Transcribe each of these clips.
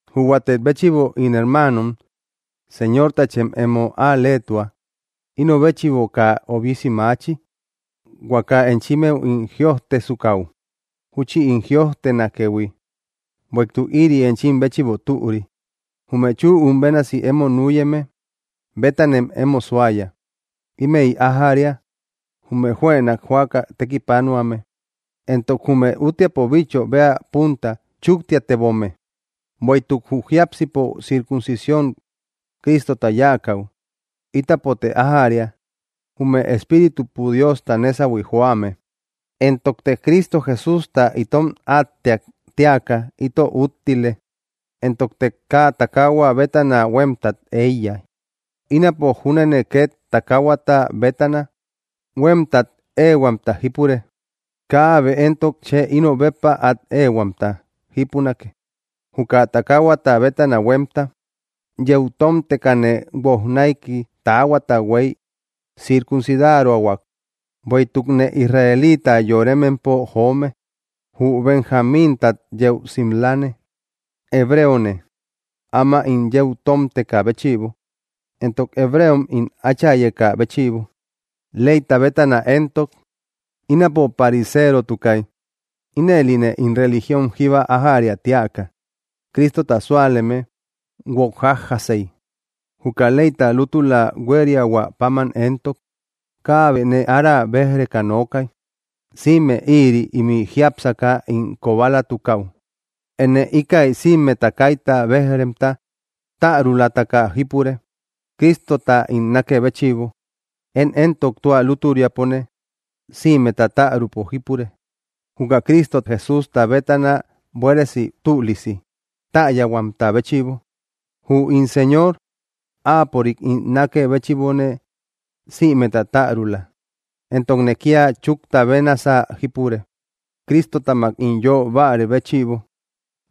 Jü huatek béchïbo, ín hermaanom, Señortachem emo al‑leetua. Ino béchïbo kaa obisi maachi, huaka enchimmeu ín jïojtesukäu júchi ín jïojtenakëhui, bueïtuk ïri enchim béchïbo türi. Jume chüum bénasi emo nüyeme bétanem emo suaya. Ímëi ájäria, jume juënak joaka tekipanuame, entok jume úttiapo bicho bea punta chuktiatebome. Bueïtuk jü jiápsipo circuncisión Cristota yáakäu, ítapote ájäria, jume espíritupo Diosta nésahui joame; entokte Cristo Jesústa itom átteak tíaka ito úttile, entokte kaa takahua bétana huémtat éiya. Ínapo júnene két takaahuata bétana huémtat éehuamta jípure. Kaabe éntok chë ino béppa át éehuamta jípunake, juka takaahuata bétana huémta. Yeu tómtekane guojnaiki taahuata huey circuncidaroahuak. Bueïtukne israeliita yoremempo joome, jü Benjamíntat yeu simlame. Hebreone, áma ín yeu tómtekä béchïbo, entok hebreom ín áchayeka béchïbo. Leyta bétana éntok, ínapo pariserotukay. Inëline ín religión jíba ájariä tíaka, Cristota súaleme guok jájjasey. Juka leyta lútula huériahua páman éntok, kaabe nee ára béj‑reka nookay. Sïme ïri ímï jiápsaka ín kobalatukäu, énne íkäi sïmeta kaita béj‑remta tärulataka jípure, Cristota ín nákë béchïbo. Én éntok tua lútüriapone sïmeta tärupo jípure, juka Cristo Jesústa bétana buéresi tülisi täyahuamta béchïbo. Jü ín Señor áapörik ín nákë béchïbone sïmeta tärula, entokne kía chúkta bénasä jípure, Cristotamak ín yö bárë béchïbo,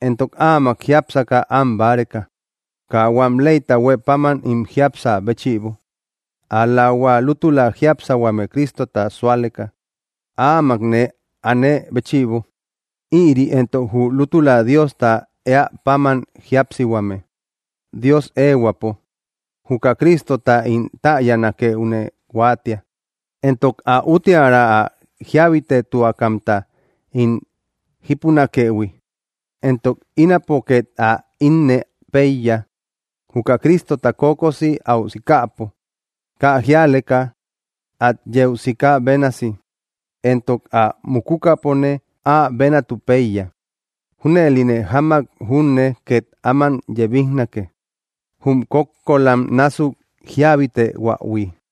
entok áamak jiápsaka an báreka, kaa huam leyta huë páman ín jiapsä béchïbo, ál‑la hua lútula jíapsihuame Cristota súaleka áamak nee aane béchïbo. Ïri éntok jü lútula Diosta éä páman jíapsihuame, Dios éehuäpo. Juka Cristota íntäyanakeune huáatia, entok ä úttiära ä jíabitetuakamta ín jípunakëhui, entok ínapo ket ä innë peiya juka Cristota kokosi aú sikäpo kaa jíaleka at yeu sika bénasi, entok ä mukukäpone áa bénatu péiya. Júnëline jamak júne két áman yebijnake, jum kókkolam násuk jíabitehuähui.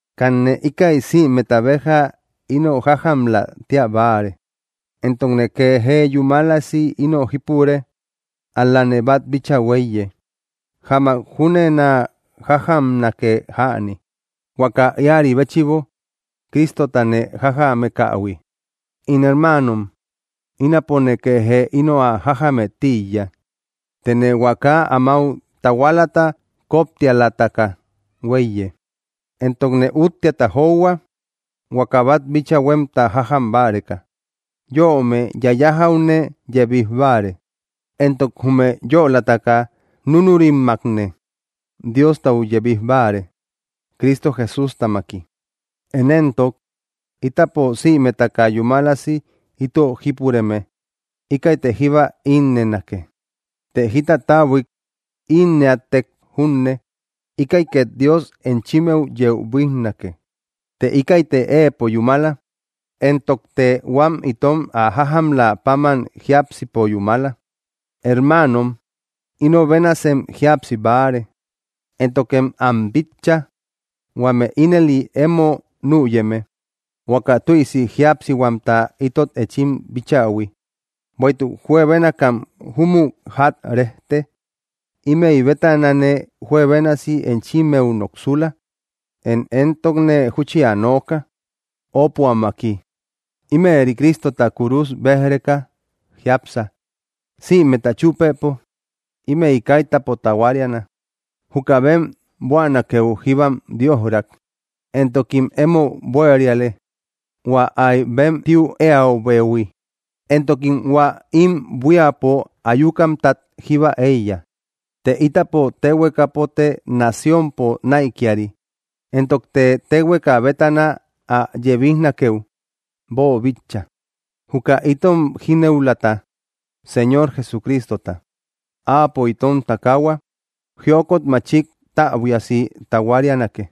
Kanne íkäi sïmeta béja ino jájamlä tía báare, entokne kee jee yúmalasi ino jípure. Ál‑lane bát bíchaa huéiye; jamak júnenä jájamnake jäni, huaka íäri béchïbo Cristota nee jájamekähui. In hermaanom, ínapone kee jee ino ä jájamë tíiya; tëne huaka amáu tahualata kóptialataka huéiye, entokne úttiata johua, huaka bát bíchaa huémta jájam báreka. Yöome yayajäune yebij báare, entok jume yölataka núnurimmakne Diostau yebij báare, Cristo Jesústamaki. Én éntok, ítapo sïmetaka yúmalasi ito jípureme íkäite jíba ínnënake. Të jita täbuik ínnëätek junne, íkäi két Dios enchimmeu yeu buíjnake. Të íkäite éepo yúmala, entokte huam itom ä jájamlä páman jiápsipo yúmala. Hermaanom, ino bénasem jíapsi báare, éntokem am bitcha, huame ínëli emo nüyeme, huaka tüisi jíapsihuamta itot enchim bíchähui. Bueïtuk juebénakam júmü ják rejte; ímëi bétanane juebénasi enchimmeu noksula. Én éntokne júchi ä nooka, ópuammaki: ímëri Cristota kúrus béj‑reka jiápsa. Sïmeta chúpëpo ímëi kaitäpo tahuariana. Juka bem buänakeu jíbam Diojrak, entokim emo buériale, hua áy bem tiu éäibehui. Entokim hua ím buíapo ayukamtat jíba éiya. Të ítapo téhuekapote naciónpo näikiari, entokte téhueka bétana ä yebijnakeu boobíchaïhui, juka itom jínëulata, Señor Jesucristota. Áapo itom takaahua jiokot machik täbuiasi tahuarianake,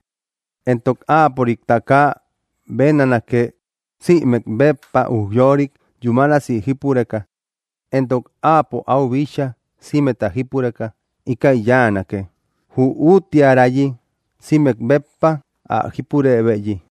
entok áapörik takaa bénanake, sïmek béppa ujyorik yúmalasi jípureka. Entok áapo áu bíchaa sïmeta jípureka íkäi yáanake, jü úttiärayi sïmek béppa ä jípurëbeyi.